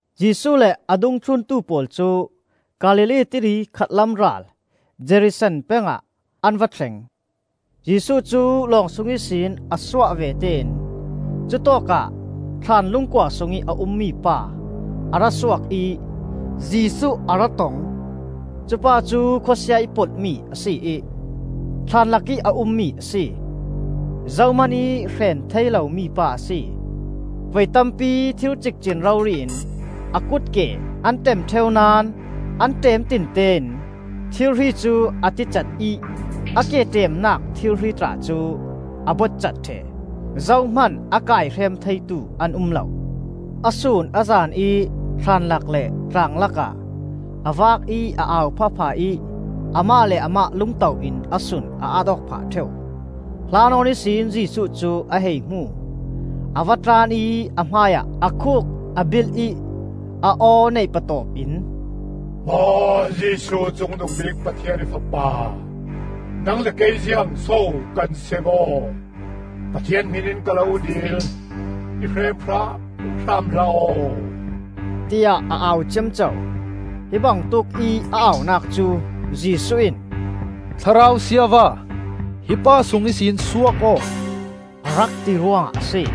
Jesuh le a dungthluntu pawl cu Galilee Tili khatlam ral Gerasene peng ah an va thleng. Jesuh cu lawng sung ihsin a suah vete in cutawkah thlaan lungkua sungih a ummi pa a ra suak ih Jesuh a ra tong. Cupa cu khawsia ih polhmi a si ih, thlaan lakih a ummi a si. Zohman ih hreen thei lomi pa a si. Voi tampi thir cikcin rori in a kutke an ṭem ṭheu naón an ṭem tinte in thirhri cu a ticat ih a ke ṭemnak thirhri tla cu a botcat ṭheh, zohman a kaihrem theitu an um lo. A sun a zan ih thlaan lak le tlang lakah a vak ih a au phahphah ih amah le amah lungto in a sun, a at aw phah ṭheu. Hla nawn ihsin Jesuh cu a hei hmu; a va tlan ih a hmai ah a khuk a bilh ih, a aw neih patawp in, “Maw Jesuh, Cungnungbik Pathian ih Fapa! Nang le kei ziangso kan seng aw? Pathian hmin in ka lo dil, i hrem hramhram hlah aw!” tiah a au ciamco. Hi bangtuk ih a aunak cu Jesuh in, “Thlarau siava, hi pa sung ihsin suak aw,” a rak ti ruangah a si.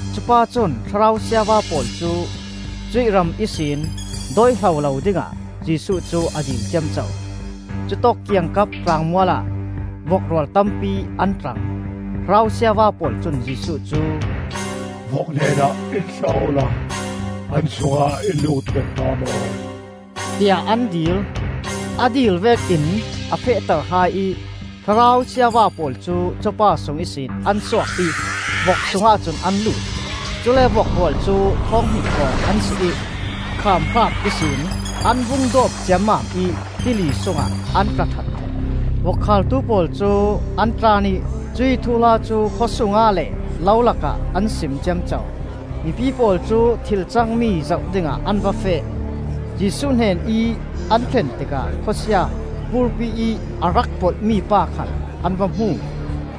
Cupa cun thlarau siava pawl cu cuih ram ihsih dawihlo lo dingah Jesuh cu a dil ciamco. Cutawk kiangkap tlangmual ah vok rual tampi an tlang. Thlarau siava pawl cun Jesuh cu, “Vok hnenah in thlah awla an sungah in lutter hram aw,” tiah an dil. A dil vek ih a fehter hai ih thlarau siava pawl cu cupa sung ihsin an suak ih vok sungah cun an lut. Cule vok rual cu thawnghnih hrawng an si ih khaamhraap ihsin an vung dawp ciammam ih tili sungah an tla that ṭheh. Vok khaaltu pawl cu an tlan ih cuih thuhla cu khawsung ah le lo lakah an sim ciamco. Mipi pawl cu thil cangmi zoh dingah an va feh. Jesuh hnenih an thlen tikah khawsia ‘Burpi,’ ih a rak polh mipa khal an va hmu.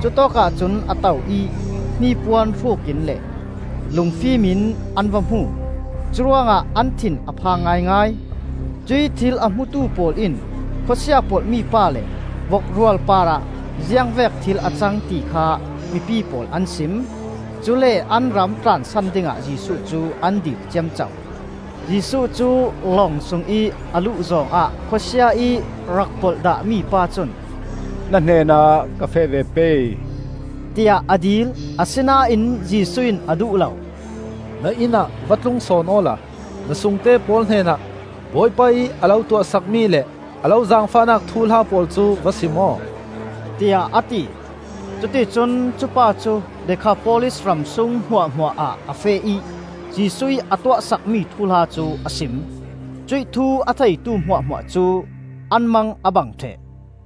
Cutawkah cun a to ih hnipuan hruk in le lungfim in an va hmu. Curuangah an thin a phang ngaingai. Cuih thil a hmutu pawl in khawsia polhmi pa le vok rual parah ziang vek thil a cang ti kha mipi pawl an sim. Cule an ram tlansan dingah Jesuh cu an dil ciamco. Jesuh cu lawng sungih a luh zawng ah khawsia ih rak polh dahmi pa cun, “Na hnenah ka feh ve pei,” tiah a dil. Asinain Jesuh in a duh lo. “Na inn ah va tlung sawn awla na sungte pawl hnenah Bawipa ih a lo tuah sakmi le a lo zaangfahnak thuhla pawl cu va sim aw,” tiah a ti. Cuticun cupa cu Dekhapolis ram sung hmuahhmuah ah a feh ih Jesuh ih a tuah sakmi thuhla cu a sim. Cuih thu a theitu hmuahhmuah cu an mang a bang ṭheh.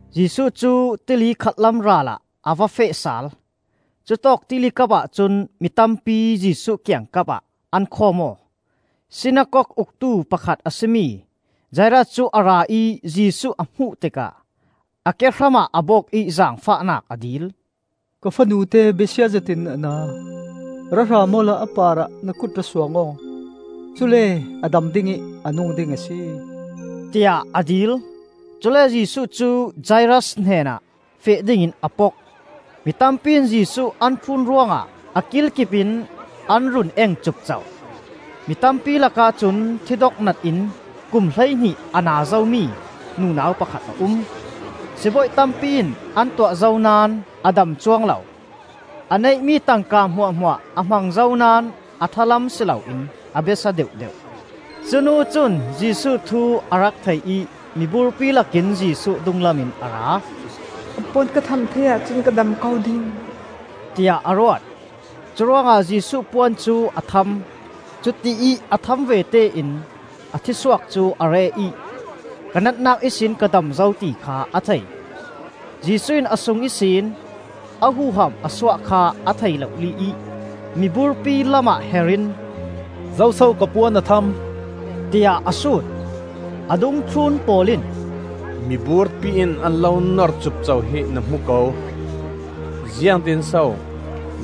Jesuh cu Tili khatlam ral ah a va feh sal. Cutawk Tilikap ahcun mi tampi Jesuh kiangkap ah an khawm aw. Sinakok uktu pakhat a si mi Jairas cu a ra ih Jesuh a hmuh tikah a ke hramah a bok ih zaangfahnak a dil. “Ka fanute besia zetin a na. Ra hram awla a parah na kut ra suang aw, cule a dam ding ih a nung ding a si,” tiah a dil. Cule Jesuh cu Jairas hnenah feh dingin a pok. Mitampi in Jesuh an thlun ruangah a kilkip in an run eng cupco. Mitampi lakah cun thidok nat in kum hleihnih a na zomi nunau pakhat a um. Sibawi tampi in an tuah zo naón a dam cuang lo. A neihmi tangka hmuahhmuah a hmang zo naón a ṭha lam si loin a besia deuhdeuh. Cunu cun Jesuh thu a rak thei ih miburpi lakin Jesuh dunglam in a ra. “A puan ka tham thei ahcun ka dam ko ding,” tiah a ruat. Curuangah Jesuh puan cu a tham. Cutiih a tham vete in a thisuak cu a reh ih ka natnak ihsin ka dam zo ti kha a thei. Jesuh in a sung ihsin a huham a suah kha a thei lohli ih miburpi lamah her in, “Zoso ka puan a tham?” tiah a sut. A dungthlun pawl in, “Miburpi in an lo nor cupco hi na hmu ko. Ziangtin so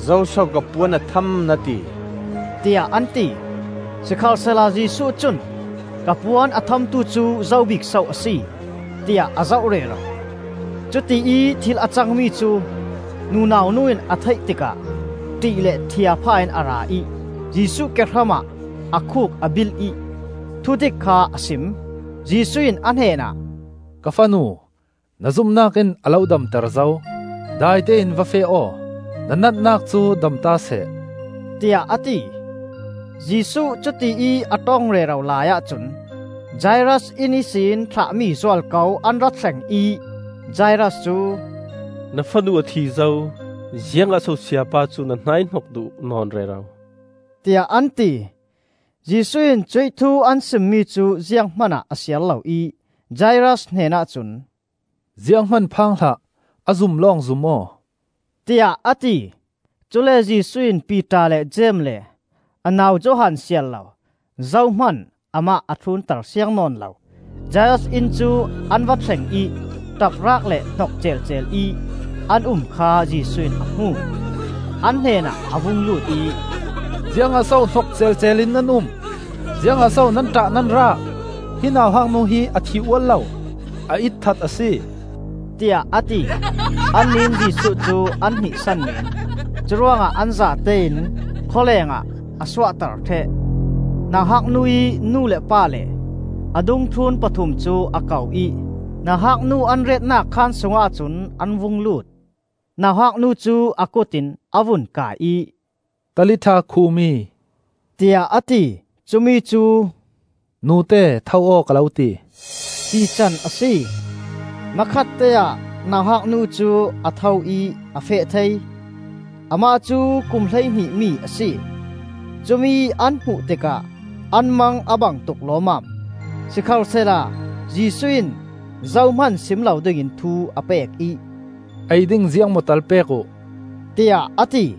‘Zoso ka puan a tham?’ na ti,” tiah an ti. Sikhalsehla Jesuh cun ka puan a thamtu cu zo bik so a si, tiah a zoh rero. Cutiih thil a cangmi cu nunau nu in a theih tikah ṭih le ṭhia phah in a ra ih Jesuh kehram ah a khuk a bilh ih thudik kha a sim. Jesuh in a hnenah, “Ka fanu, na zumnak in a lo damter zo. Dai tein va feh aw, na natnak cu damta seh,” tiah a ti. Jesuh cutiih a ṭong rero laiah cun Jairas inn ihsin thlahmi zualko an ra thleng ih Jairas cu, “Na fanu a thi zo. Ziangah so Sayapa cu na hnaihnok duh nawn rero,” tiah an ti. Jesuh in cuih thu an simmi cu ziang hmanah a siar lo ih Jairas hnenah cun, “Zianghman phang hlah, a zum lawng zum aw,” tiah a ti. Cule Jesuh in Piter le Jeim le a nau Johan siar lo zohman amah a thlunter siang nawn lo. Jairas inn cu an va thleng ih ṭapraak le hnok ceelceel ih an um kha Jesuh in a hmu. An hnenah a vung lut ih, “Ziangah so hnok ceelceel ih nan um? Ziangah so nan ṭah nan raak! Hi nauhak nu hi a thih ual lo; a itthat a si,” tiah a ti. Annih in Jesuh cu an hnihsan meen. Curuangah an zatein khawlengah a suahter ṭheh. Nauhak nu ih nu le pa le a dungthlun pathum cu a ko ih nauhak nu an retnak khaan sungah cun an vung lut. Nauhak nu cu a kut in a vun kai ih, “Talitha koumi,” tiah a ti. Cumi cu, “Nute tho aw ka lo ti,” tican a si. Hmakhatteah nauhak nu cu a tho ih a feh thei. (Amah cu kum hleihnih mi a si.) Cumi an hmuh tikah an mang a bangtuk lawmmam. Sikhalsehla Jesuh in zohman sim lo dingin thu a pek ih, “Ei ding ziangmaw tal pek uh,” tiah a ti.